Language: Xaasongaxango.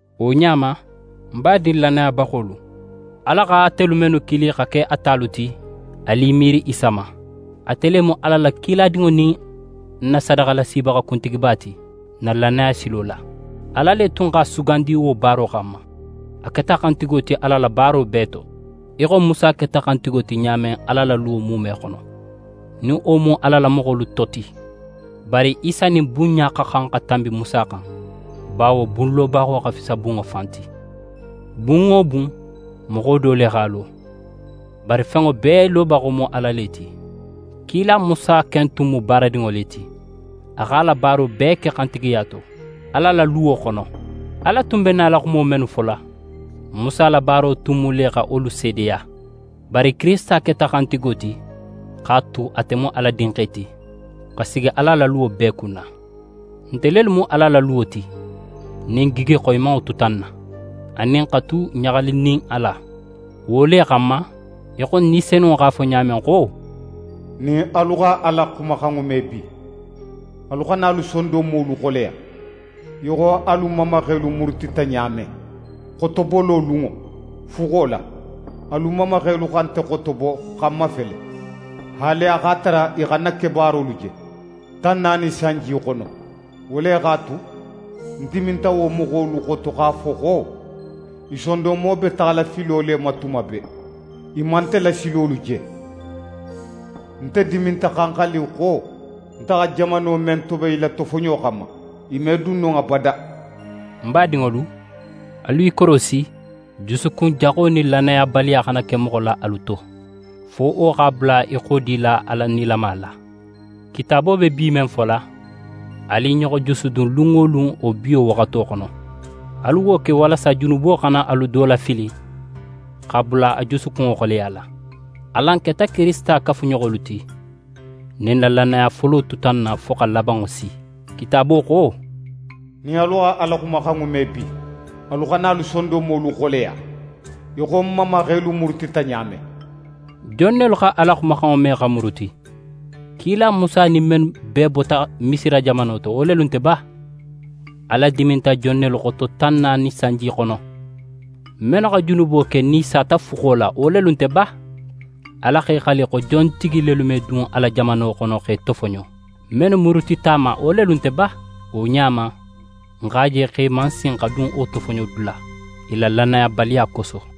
Wo ɲa ma, ń badin lannayabaxolu, Ala xa atelu mennu kili xa ke a talu ti, alu i miiri Isa ma. Ate le mu Ala la kiladinŋo nin n na sadaxalasibaxa kuntigiba ti n na lannaya silo la. Ala le tun x'a sugandi wo baaro xanma. A keta xantigo ti Ala la baaro bee to, í xo Musa keta xantigo ti ɲa men Ala la luwo muume xono, nin wo mu Ala la moxolu to ti. Bari Isa nin bunɲa xa xan xa tanbi Musa xan, bawo bunlobaxo xa fisa bunŋo fan ti. Bun wo bun, moxo do le x'a lo; bari fenŋo bee lobaxo mu Ala le ti. Kila Musa ken tun mu baaradinŋo le ti. A x'a la baaro bee ke xantigiya to, Ala la luwo xono. Ala tun be nala xumo mennu fola, Musa la baaro tun mu le xa wolu seedeya. Bari Kirisita keta xantigo ti x'a tu ate mu Ala Dinxe ti, xa sigi Ala la luwo bee kunna. Nte lelu mu Ala la luwo ti, nin n gigi xoyimanŋo tuta n na, anin xa tu ɲaxalinin a la. Wo le xanma, í xo Ni Senunŋo x'a fo ɲa men xo: «Nin alu xa Ala xumaxanŋo me bi, alu xana alu sondonmolu xoleya, í xo alu mamaxelu murutita ɲa men, xotobolo lunŋo, fuxo la. Alu mamaxelu xa nte xotobo xa ń mafele, haali a x'a tara i xa ń na kebaarolu je, tan naani sanji xono. Wo le x'a tu, ń diminta wo moxolu xoto x'a fo xo: “I sondonmo be taxala filo le ma tuma bee. I man nte la silolu je.” Nte diminta xa ń xali xo: Nte xa jamano men toben i la tofoɲo xanma, i me dun non abada.» Ń badinŋolu, alu i korosi jusukun jaxo nin lannayabaliya xana ke moxo la alu to, fo wo x'a bula i xodila Ala nilama la. Kitaabo be «bi» men fola, alu i ɲoxo jusudun lun wo lun wo «biwo» waxato xono. Alu wo ke walasa junubo xana alu do lafili x'a bula a jusukunŋo xoleyala. Alan keta Kirisita kafuɲoxolu ti, nin n na lannaya folo tuta n na fo xa labanŋo si. Kitaabo xo: «Nin alu xa Ala xumaxanŋo me bi, alu xana alu sondonmolu xoleya, í xo n mamaxelu murutita ɲa men.» Jon nelu xa Ala xumaxanŋo me xa muruti? Kila Musa nin mennu bee bota Misira jamano to, wo lelu nte ba? Ala diminta jon nelu xoto tan naani sanji xono? Mennu xa junubo ke nin i sata fuxo la, wo lelu nte ba? Ala x'é xali xo jontigi lelu me dun a la jamano xono x'e tofoɲo? Mennu murutita a ma, wo lelu nte ba? Wo ɲa ma, n x'a je xo i man sin xa dun wo tofoɲodula, i la lannayabaliya koso.